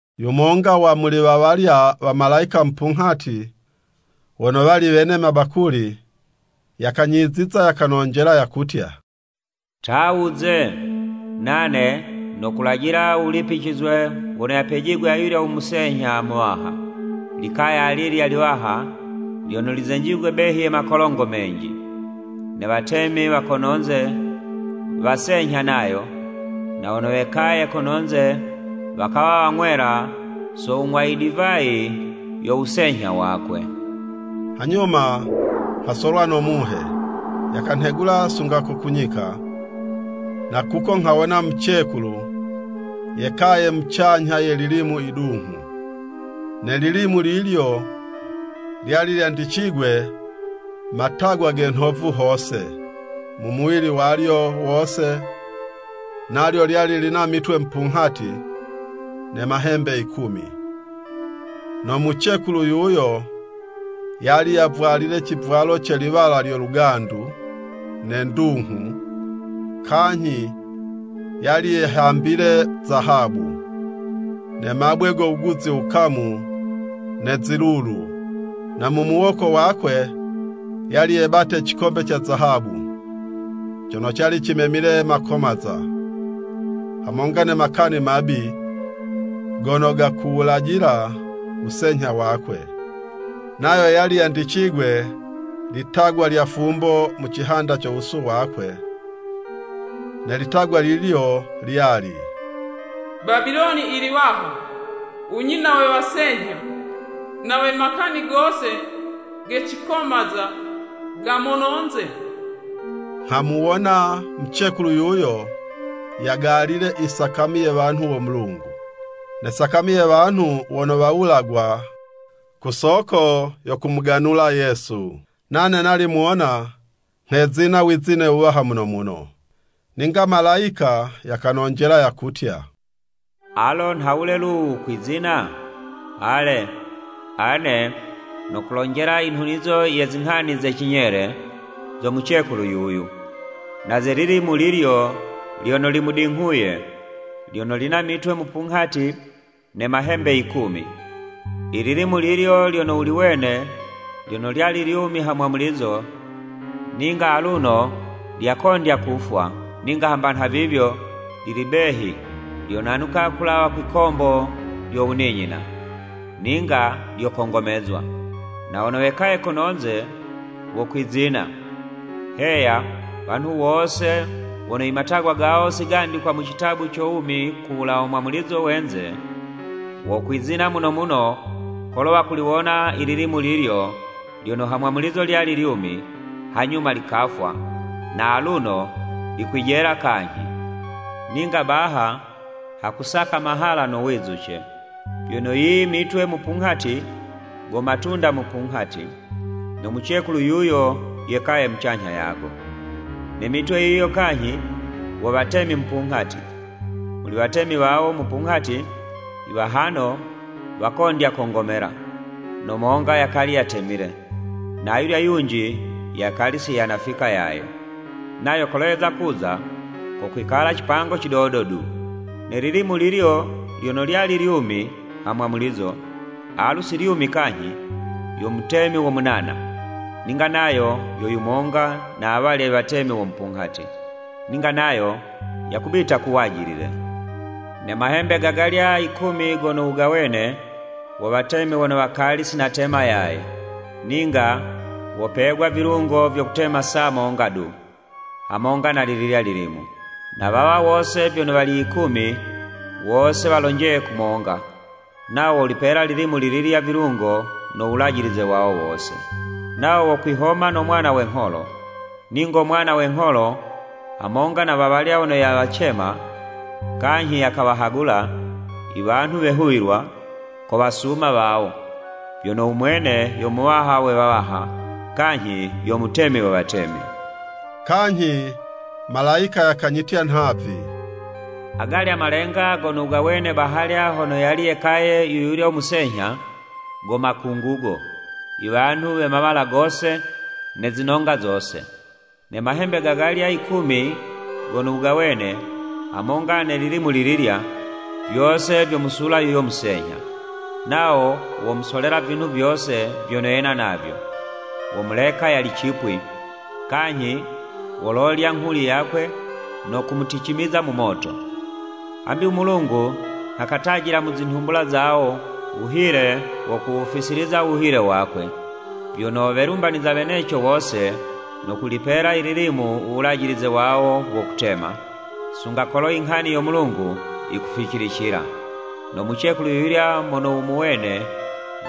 Yumonga wa muli wa walya wamalayika mupunghati wono wali wene mabakuli, yakanyiziza, yakanonjela yakutya, “Ta wuze! Nane nokulajila u wulipicizwe wono yapejigwe ayulyo u musenyha muwaha, i likaya alilya liwaha, lyono lizenjigwe behi ye makolongo menji. Ne watemi wa kono'nze wasenyha nayo, na wono wekaye kono'nze wakawa wang'wela so wung'wa i divayi yo wusenyha wakwe.” Hanyuma nghasolwa no Muhe, yakanhegula sunga ko ku nyika. Na kuko, nghawona mucekulu yekaye mucanyha ye lilimu yidunghu. Ne lilimu lilyo lyali lyandicigwe matagwa ge nhovu hose, mu muwili walyo wose, nalyo lyali lina mitwe mupunghati ne mahembe yikumi. No mucekulu yuyo yali yavwalile civwalo ce liwala lyo lugandu ne ndunghu, kanyhi yali yehambile zahabu, ne mabwe go wuguzi wukamu ne zilulu. Na mu muwoko wakwe yali yebate cikombe ca zahabu, cono cali cimemile makomaza, hamonga ne makani mabi, gono gakuwulajila wusenyha wakwe. Nayo yali yandicigwe litagwa lya fumbo mu cihanda co wusu wakwe, ne litagwa lilyo lyali, “Babiloni i liwaha, u nyina we wasenyha, na we makani gose ge cikomaza ga mononze.” Nghamuwona mucekulu yuyo yagalile i sakami ye wanhu wo Mulungu, ne sakami ye wanhu wono wawulagwa ku soko yo kumuganula Yesu. Nane nali muwona, nghezina wizine wuwaha muno muno. Ninga malayika yakanonjela yakutya, “Alo, nhawule lu, wukwizina? Ale, ane nokulonjela i nhunizo ye zinghani ze cinyele zo mucekulu yuyu, na ze lilimu lilyo lyono limudinghuye, lyono lina mitwe mupunghati ne mahembe yikumi. I lilimu lilyo lyono wuliwene, lyono lyali lyumi hamwamulizo, ninga aluno lyakondya kufwa. Ninga hamba nhavivyo, lili behi lyonanuka kulawa kwikombo lyo wuninyina, ninga lyokongomezwa. Na wono wekaye kono'nze, wokwizina, heya, wanhu wose wono i matagwa gawo si gandikwa mu citabu co wumi ku wulawa mwamulizo we'nze, wokwizina muno muno kolo wakuliwona i lilimu lilyo lyono ha mwamulizo lyali lyumi, hanyuma likafwa, na aluno likwijela kanyhi! “Ninga baha, hakusaka mahala no wizuce! Vyono yiyo i mitwe mupunghati, go matunda mupunghati, no mucekulu yuyo yekaye mucanyha yago. Ne mitwe yiyo kanyhi, wo watemi mupunghati. Muli watemi wawo mupunghati, i wahano wakondya kongomela, no monga yakali yatemile, na ayulya yunji, yakali si yanafika yaye, nayo kolo yeza kuza, kokwikala cipango cidodo du. Ne lilimu lilyo lyono lyali lyumi ha mwamulizo, alu si lyumi kanyhi, yo mutemi wo munana, ninga nayo yo yumonga na awalya i watemi wo mupunghati, ninga nayo yakubita ku wajilile. “Ne mahembe gagalya yikumi gono wugawene, wo watemi wono wakali si natema yaye. Ninga wopegwa vilungo vyo kutema saa monga du, hamonga na lililya lilimu. Na wawa wose vyono wali yikumi, wose walonjeye kumonga, nawo wolipela lilimu lililya vilungo no wulajilize wawo wose. Nawo wokwihoma no Mwana we ngholo, ningo Mwana we ngholo, hamonga na wawala wono yawacema, kanyhi yakawahagula, i wanhu wehuwilwa, kowasuma wawo, vyono u mwene yo Muwaha we wawaha, kanyhi yo Mutemi we watemi.” Kanyhi malayika yakanyitya nhavi, “Agalya malenga gono wugawene bahalya hono yali yekaye yu yulya musenyha, go makungugo, iwanhu we mawala gose ne zinonga zose. Ne mahembe gagalya yikumi gono wugawene, hamonga ne lilimu lililya, vyose vyomusula yuyo musenyha. Nawo womusolela vinhu vyose vyono yena navyo, womuleka yali cipwi, kanyhi wololya nghuli yakwe no kumuticimiza mu moto. Hambi u Mulungu nha katajila mu zinhumbula zawo, wuhile wo kuwufisiliza wuhile wakwe, vyono welumbaniza weneco wose, no kulipela i lilimu u wulajilize wawo wo kutema, sunga kolo i nghani yo Mulungu yikuficilicila. “No mucekulu yuyulya mono wumuwene,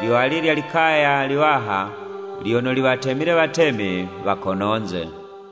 lyo alilya likaya liwaha lyono liwatemile watemi wa kononze.”